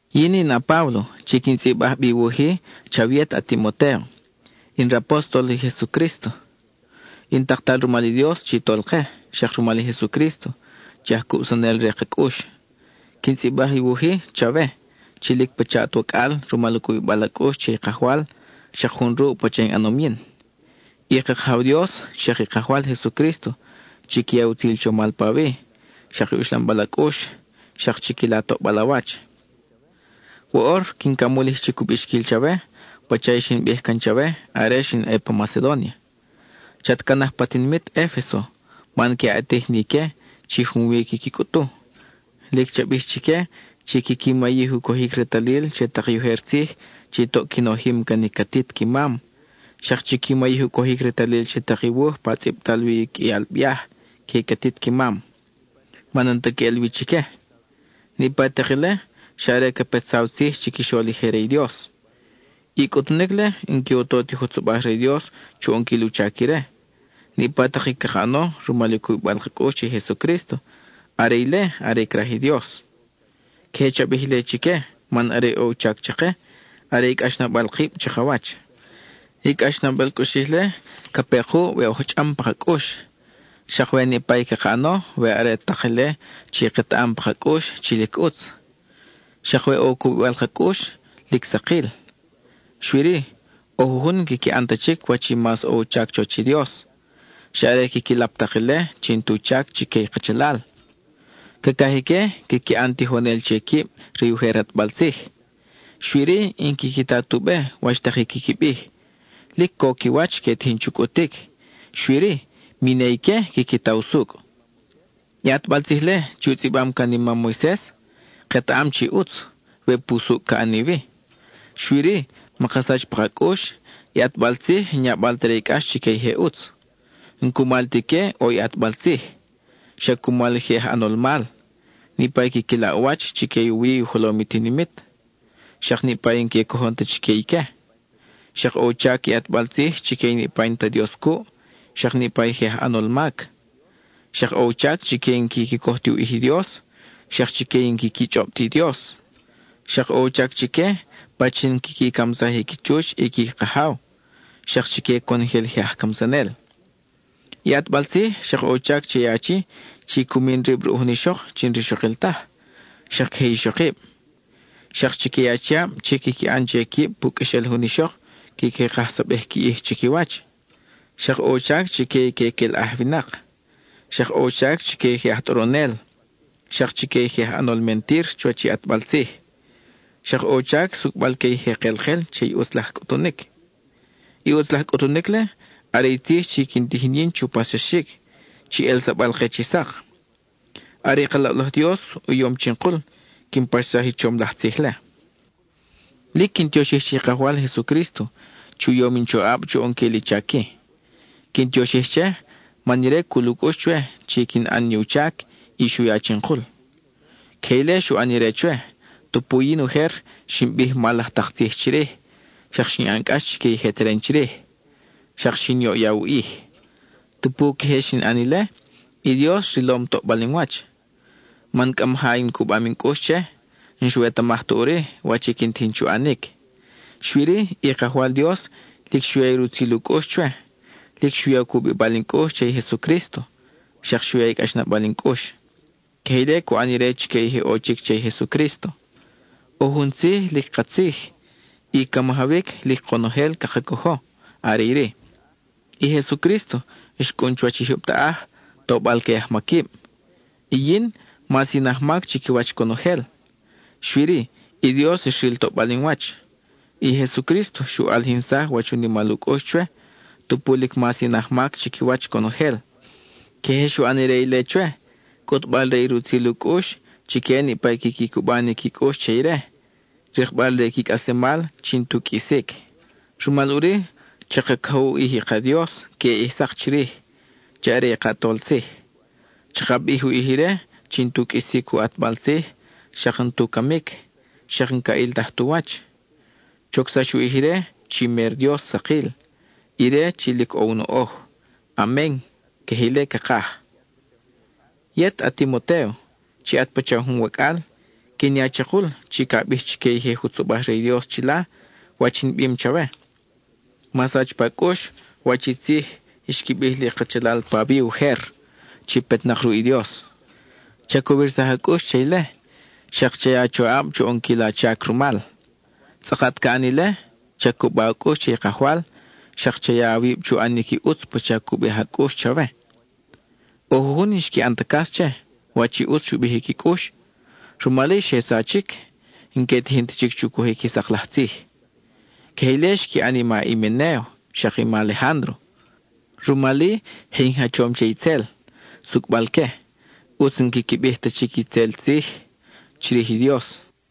Yin in a-Páblo chi quin tzʼibaj bi i wuj-i chawe yet a-Timotéo; in rapóstol i Jesucrísto, in taktal rumal i Dios chi Tolke, xak rumal i Jesucrísto, chi aj cubsanel re ka cʼux. Quin tzʼibaj i wuj-i chawe, chi lic pacha at wacʼal rumal u cubibal a cʼux che i Kajwal xak jun ruʼ pacha in ʼanom yin. I ka Kajaw Dios, xak i Kajwal Jesucrísto chiqui ya i utzil chomal pawi, xak i uxlambal a cʼux, xak chiquila toʼbal a wach. Woʼor quin camulij chic u bixquil chawe pacha i xin bij can chawe are xin ʼe pa Macedónia: chat canaj pa tinimit Efeso man que a ʼatij ni ique chi junwi quiqui cʼutu. Lic cha bij chique chi quiqui mayij u cojic retalil che tak i ujer tzij chi toʼ qui nojim can i catit qui mam, xak chiqui mayij u cojic retalil che tak i wuj pa tzʼibtal wi u qʼuial biaj que i catit qui mam, man n-ta queʼel wi chique. Niʼpa tak ile, xa are ca petsaw tzij chiquixol i je re i Dios. I cʼutunic-le n-que u to ti jutzobaj re i Dios chu ʼonquil u chac ire; niʼpa tak i caka ʼano rumal i u cubibal ka cʼux che i Jesucrísto, are ile are craj i Dios. Queje cha bij ile chique man are i ʼo u chac chake, are i cʼaxnabal kib chakawach. I cʼaxnabal cʼuxij-le ca pe kuʼ we oj chʼam paka cʼux, xak we niʼpa i caka ʼano we are tak ile chi ketaʼam pa ka cʼux chi lic ʼutz; xak we ʼo i u cubibal ka cʼux lic sakil. Xui-ri, ʼo jujun n-quiqui ʼan ta chic wach i mas ʼo u chac chuwach i Dios, xa are quiqui lap tak ile chi n-tu chac chique i kachalal. Cacaj ique quiqui ʼan tijonel che quib re i ujer ʼatbal tzij, xui-ri n-quiqui ta tu be wach tak i quiqui bij; lic co qui wach que tijin chu cʼutic, xui-ri mi ne ique quiqui ta usucʼ. I ʼatbal tzij-le chi u tzʼibam can i mam Moises, ketaʼam chi ʼutz, we pusucʼ ca ʼani wi. Xui-ri, maka sach pa ka cʼux, i ʼatbal tzij n-yabal ta re i cʼax chique i je ʼutz. N-cumal ti ique ʼo i ʼatbal tzij, xa cumal i je aj ʼanol mal: niʼpa i quiqui laʼ u wach chique i u wi u jolom i tinimit, xak niʼpa i n-que cojon ta chique ique; xak ʼo u chac i ʼatbal tzij chique niʼpa i n-ta Dios cuʼ, xak niʼpa i je aj ʼanol mac; xak ʼo u chac chique i n-quiqui coj ti u ʼij i Dios, xak chique i n-quiqui chʼob ti Dios; xak ʼo u chac chique pachin quiqui camsaj i qui chuch i qui kajaw, xak chique conojel i je aj camsanel. I ʼatbal tzij xak ʼo u chac che i achi chi cu min rib ruʼ jun ixok chi n-rixokil taj, xak queje i ixokib; xak chique i achiab chi quiqui ʼan che quib pu qʼuexel jun ixok quiqui kajsabej qui ʼij chiquiwach; xak ʼo u chac chique i que quelʼaj winak; xak ʼo u chac chique i je aj tʼoronel; xak chique i je aj ʼanol mentir chuwach i ʼatbal tzij. Xak ʼo u chac sucʼbal-que i je kelkel che i ʼutz laj cʼutunic. I ʼutz laj cʼutunic-le, are i tzij chi quin tijin yin chu paxsaxic, chi ʼelsabal-ke chi sak. Are i ka loʼlaj Dios u yom chinkul quin paxsaj i chom laj tzij-le. Lic quin tioxij che i Kajwal Jesucrísto chi u yom in choʼab chu ʼonquil i chac-i. Quin tioxij che, man ire cul u cʼux chwe chi quin ʼan ni u chac, y xu ya chinkul. Queje ile xu ʼan ire chwe, tupu yin ujer xin bij mal laj tak tzij chirij, xak xin ʼan cʼax chique i je teren chirij, xak xin yoʼya u ʼij. Tupu queje xin ʼan ile, i Dios rilom toʼbal in wach, man cʼa maja in cubam in cʼux che, n-xwetamaj ta ʼuri wach i quin tijin chu ʼanic. Xui-ri, i Kajwal Dios lic xu ya i rutzil u cʼux chwe, lic xu ya u cubibal in cʼux che i Jesucrísto, xak xu ya i cʼaxnabal in cʼux. Queje ile cu ʼan ire chique i je ʼo chic che i Jesucrísto. ʼO jun tzij lic katzij, y ca majawic lic konojel caka cojo; are iri: i Jesucrísto xcʼun chuwach i jyub taʼaj, tobal que i ajmaquib. Y yin, mas in ajmac chiquiwach conojel. Xui-ri, i Dios xril toʼbal in wach; i Jesucrísto xu ʼalijinsaj wach u nimal u cʼux chwe, tupu lic mas in ajmac chiquiwach conojel. Queje xu ʼan ire ile chwe, cʼutbal-re i rutzil u cʼux chique niʼpa i quiqui cuba ni qui cʼux che ire, rikbal re i qui cʼaslemal chi n-tu qʼuisic. Rumal ʼuri chaka cojo u ʼij i ka Dios queʼe ʼij sak chirij, chi are i ka ʼAtol Tzij; chaka bij u ʼij ire chi n-tu qʼuisic u ʼatbal tzij, xak n-tu camic, xak n-ca ʼiltaj tu wach. Chocsax u ʼij ire chi mer Dios sakil, ire chi lic ʼo u noʼoj. Amen (queje ile cakaj). Yet, a-Timotéo, chi at pacha jun wacʼal, quin ya chakul chi ca bij chique i je jutzobaj re i Dios chila, wach in bim chawe. Ma sach pa cʼux wach i tzij xqui bij li kachalal pawi ujer, chi petnak ruʼ i Dios. Cha cowirsaj a cʼux che ile, xak cha ya a choʼab chu ʼonquil a chac rumal. Tzʼakat ca ʼan ile, cha cuba a cʼux che i Kajwal, xak cha ya awib chu ʼanic i ʼutz pacha cu bij a cʼux chawe. ʼO jujun n-xqui ʼan ta cas che, wach i ʼutz xu bij i qui cʼux, rumal-i xe sachic n-que tijin ta chic chu cojic i sak laj tzij. Queje ile xqui ʼan i ma Himenéo xak i ma Alejándro. Rumal-i, je in jachom che itzel, sucʼbal-que, ʼutz n-quiqui bij ta chic itzel tzij chirij i Dios.